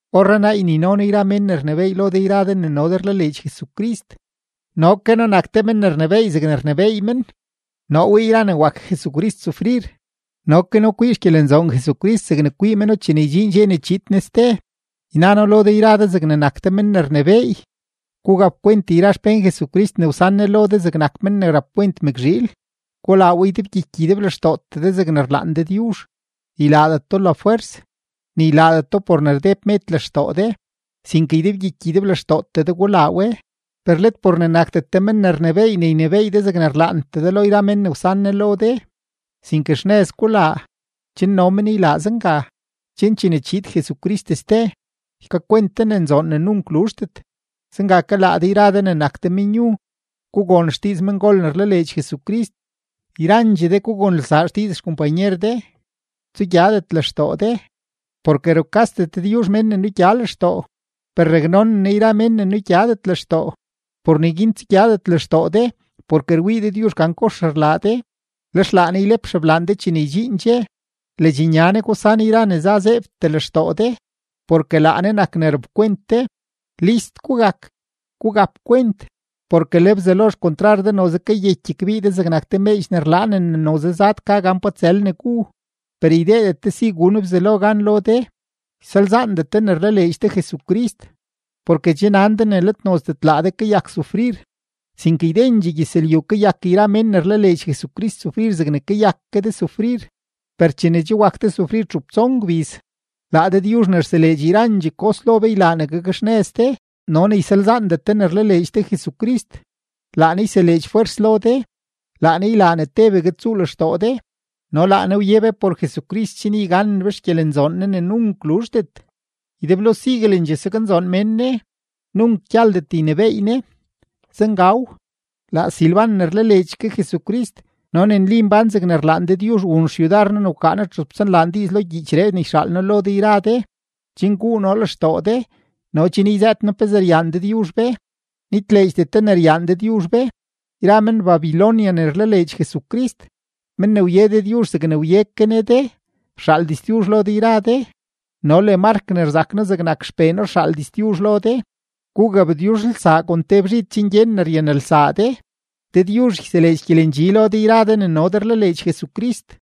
Orrenaa ynino noo yra mén ne rnebééy lo de yra de ne no de rlaleedx Jesucrist. No ke noo nak te men ne rnebééy zegne rnebééy men. Noo wii yra ne wak Jesucrist sufrir no ke noo kwii xgyelenzoon Jesucrist zegne kwii meno chene ydxiin dxe ne chiid Jesucrist ste. Yna noo lo de yra de zegne nak de men ne rnebééy, gugapkwent yra xpén Jesucrist ne wsan Ne lo de zegnak men ne rapkwent mëkzhiil; gulaa we ydebgyiky ydeblextootee de zegne rlaan Dëdyuzh; ylaadet do lafwers, ni ylaadet do por ne rdeb med lextoo de, sinke ydebgyiky ydeblextootee de gulaa we; per let por ne nakdet de men ne rnebééy ne ynebééy de zegne rlaantee de lo yra men ne wsan Ne lo de, sinke xnëz gulaa, chen no men ylaa zenga. Chen chene chiid Jesucrist ste, ykakwent de ne nzoon ne nunk luzhdet. Zenga ke laa de yra de ne nak de menyu, gugon xdiiz mengol ne rlaleedx Jesucrist. Yrandxee de gugonelsaa xdiiz xkompanyer de, tsugyadet lextoo de, porke: Rukasdet Dëdyuzh mén ne nugya lextoo, per raknonen Ne yra mén ne nugyadet lextoo. Por neguin tsugyadet lextoo de porke rwii Dëdyuzh gan kox rlaa de, lex laa Ne ylep xeblaan de chene ydxiin dxe. Ledxnya Ne gusan yra ne za zeebtee lextoo de, porke laa Ne nak ne rapkwent de. List gugak; gugap kwent. Porke le Bzelo xkontrar de noze kayeky kbii de zegnak te meedx ne rlaanen ne noze zad ka gan pa tsël ne gu. Per ydeedet de si gun Bzelo gan lo de, ysalzaandet de ne rlaleedx de Jesucrist, porke che nan de ne let nozdet laa de kayak sufrir, sinke ydendxee gyëzlyu kayak yra men ne rlaleedx Jesucrist sufrir zegne kayak ke de sufrir. Per chene che wak de sufrir txup tson gbiz, laa Dëdyuzh ne rseleedx yrandxee kos lo be ylaa ne gakxnëz de no ne ysalzaandet de ne rlaleedx de Jesucrist, laa Ne yseleedx fwers lo de, laa Ne ylaa ne tebegue tsuu lextoo de, no laa Ne wye be por Jesucrist chen yganen be xgyelenzoon Ne ne nunk luzhdet. Ydeblo siguelendxee saknzoon mén Ne. Nunk gyaldet ynebééy Ne. Zengaw. Laa Silban ne rlaleedx ke Jesucrist no ne nli mbán zegne rlaan Dëdyuzh wun xyudar noo ne wkaa txup tson laan diiz lo gyiichree ne yxaal noo lo de yra de, chen guu noo lextoo de no chen yzëët noo pezee ryaan Dëdyuzh be. Nitleedxdet de ne ryaan Dëdyuzh be. Yra men-Babilonia ne rlaleedx Jesucrist, men ne wye Dëdyuzh zegne wye ke Ne de rxaal diztyuzh lo de yra de, no le Mark ne rzak noo zegnak xpee noo rxaal diztyuzh lo de. Gugabtyuzhelsaa kon te bzhid chen gyen ne ryanelsaa de. Dëdyuzh yseleedx gyelendxi lo de yra de ne no de rlaleedx Jesucrist.